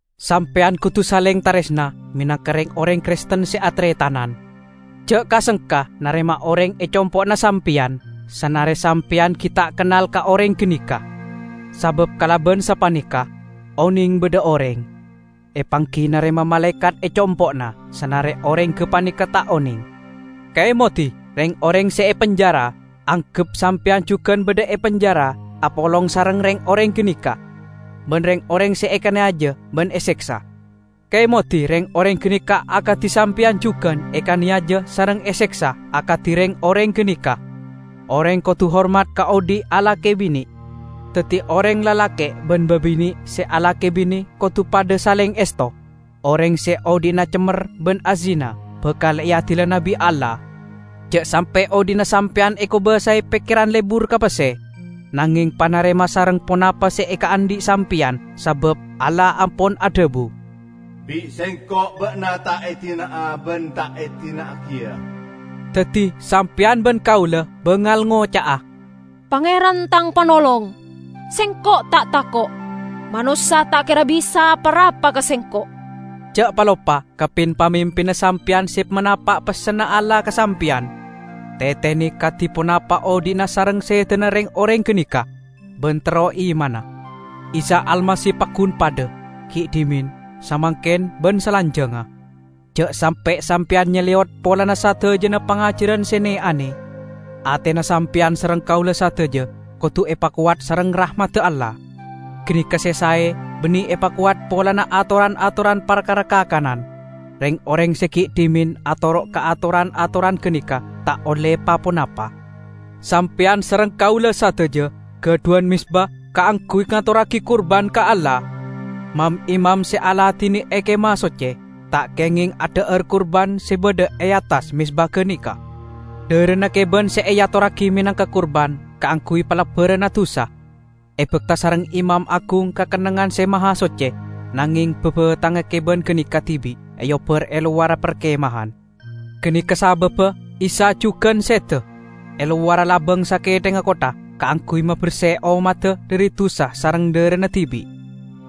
Sampeyan kodu saleng taresna menangka reng-oreng Kristen se ataretanan. Ja' ka-sengka narema oreng e compo'na sampeyan, sanare sampeyan gi' ta' kennal ka oreng ganeka. Sabab kalaban sapaneka, oneng badha oreng, epanggi narema malaekat e compo'na sanare oreng gapaneka ta' oneng. Kaemodi reng-oreng se epenjara, anggep sampeyan jugan badha e penjara apolong sareng reng-oreng ganeka. Ban reng-oreng se ekaneyaja ban eseksa, kaemodi reng-oreng ganeka akadi sampeyan jugan ekaneyaja sareng eseksa akadi reng-oreng ganeka. Oreng kodu hormat ka odhi' alake bine, daddi oreng lalake' ban babine' se alake bine kodu padha saleng esto. Oreng se odhi'na cemmer ban azina bakal eadilana bi' Allah. Ja' sampe' odhi'na sampeyan ekobasae pekkeran lebur ka pesse, nangeng panarema sareng ponapa se ekaandhi' sampeyan. Sabab Allah ampon adhabu, "Bi' Sengko' ba'na ta' edina'a ban ta' edina'agiya." Daddi sampeyan ban kaula bangal ngoca'a, "Pangeran tang Panolong, sengko' ta' tako'. Manossa ta' kera bisa apa-rapa ka sengko'." Ja' paloppa ka pin-pamimpinna sampeyan se manapa' pessenna Allah ka sampeyan. Tetene kadi ponapa odhi'na sareng sedana reng-oreng ganeka, ban tero imanna. Isa Almasih paggun padha, gi' dhimen, samangken ban salanjangnga. Ja' sampe' sampeyan nyaleyot polana sadajana pangajaran se ne-ane. Atena sampeyan sareng kaula sadaja kodu epakowat sareng rahmadda Allah; ganeka se sae, banne epakowat polana atoran-atoran parkara kakanan. Reng-oreng se gi' dhimen atoro' ka atoran-atoran ganeka ta' olle pa-ponapa. Sampeyan sareng kaula sadaja gadhuwan mezba kaangguy ngatorragi kurban ka Allah. Mam-imam se aladine e Kemah Socce, ta' kengeng adha'ar kurban se badha e attas mezba ganeka. Dharana keban se eatorragi menangka kurban kaangguy palebbaranna dusa, ebakta sareng imam agung ka Kennengngan Se Mahasocce, nangeng babathangnga keban ganeka dibi' eobbar e lowarra parkemahan. Ganeka sababba Isa jugan seda e lowarra labang sakethengnga kottha kaangguy maberse ommadda dhari dusa sareng dharana dibi'.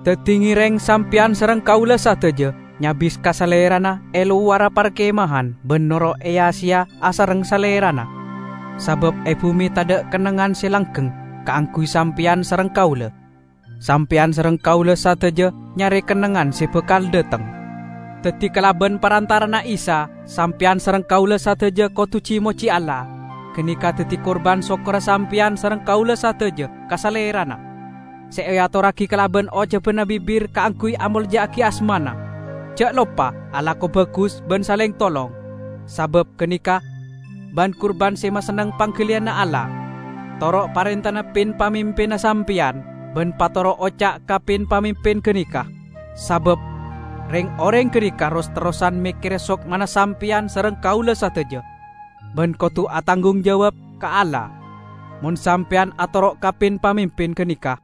Daddi, ngereng sampeyan sareng kaula sadaja nyabis ka Salerana e lowarra parkemahan ban noro' eya-seya asareng Salerana. Sabab e bume tadha' kennengngan se langgeng kaangguy sampeyan sareng kaula; sampeyan sareng kaula sadaja nyare kennengngan se bakal dhateng. Daddi, kalaban parantara'anna Isa, sampeyan sareng kaula sadaja kodu ji-moji Allah; ganeka daddi kurban sokkorra sampeyan sareng kaula sadaja ka Salerana, se eatorragi kalaban ocabanna bibir kaangguy amolja'agi asmana. Ja' loppa alako bagus ban saleng tolong, sabab ganeka ban-kurban se masenneng panggaliyanna Allah. Toro' parentana pin-pamimpinna sampeyan, ban patoro' oca' ka pin-pamimpin ganeka. Sabab reng-oreng ganeka ros-terrosan mekkere sokmana sampeyan sareng kaula sadaja, ban kodu atanggung jawab ka Allah. Mon sampeyan atoro' ka pin-pamimpin ganeka,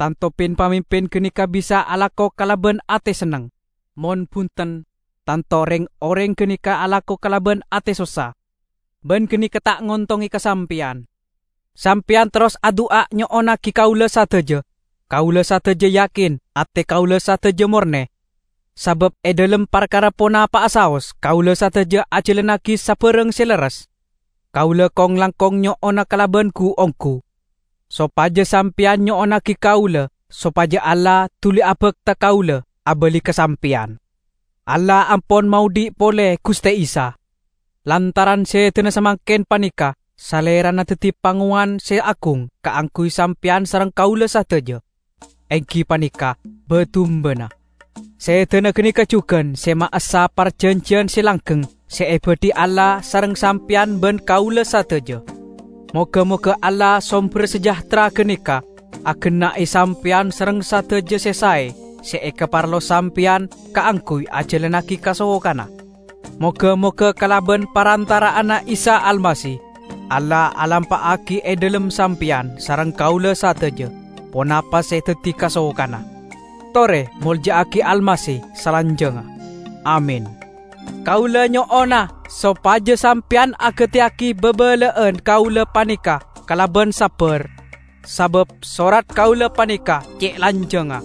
tanto pin-pamimpin ganeka bisa alako kalaban ate senneng; mon bunten, tanto reng-oreng ganeka alako kalaban ate sossa, ban ganeka ta' ngontonge ka sampeyan. Sampeyan terros adu'a nyo'onnagi kaula sadaja. Kaula sadaja yakin ate kaula sadaja morne, sabab e dhalem parkara ponapa'a saos kaula sadaja ajalannagi sabarang se lerres. Kaula kong-langkong nyo'ona kalaban gu-onggu, sopaja sampeyan nyo'onnagi kaula sopaja Allah duli abakta kaula abali ka sampeyan. Allah ampon maodhi' pole Guste Isa. Lantaran sedana samangken paneka Salerana daddi Pangowan Se Agung kaangguy sampeyan sareng kaula sadaja, enggi paneka ba-dumbana. Sedana ganeka jugan se maessa parjanjiyan se langgeng se ebadhi Allah sareng sampeyan ban kaula sadaja. Moga-moga Allah somberra sejahtera ganeka agenna'e sampeyan sareng sadaja se sae se ekaparlo sampeyan kaangguy ajalannagi kasokanna. Moga-moga kalaban parantara'anna Isa Almasih, Allah alampa'agi e dhalem sampeyan sareng kaula sadaja ponapa se daddi kasokanna. Tore molja'agi Almasih salanjangnga! Amin! Kaula nyo'ona sopaja sampeyan agateyagi babala'an kaula paneka kalaban sabbar, sabab sorat kaula paneka ce' lanjangnga.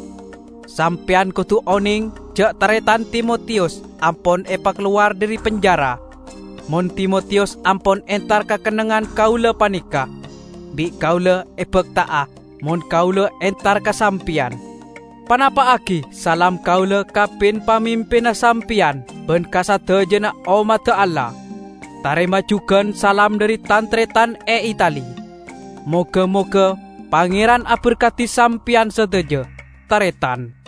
Sampeyan kodu oneng ja' taretan Timotiyus ampon epakalowar dhari penjara. Mon Timotiyus ampon entar ka kennengngan kaula paneka, bi' kaula ebakta'a mon kaula entar ka sampeyan. Panapa'agi salam kaula ka pin-pamimpinna sampeyan ban ka sadajana ommadda Allah. Tarema jugan salam dhari tan-taretan e Itali. Moga-moga Pangeran aberkadi sampeyan sadaja, taretan.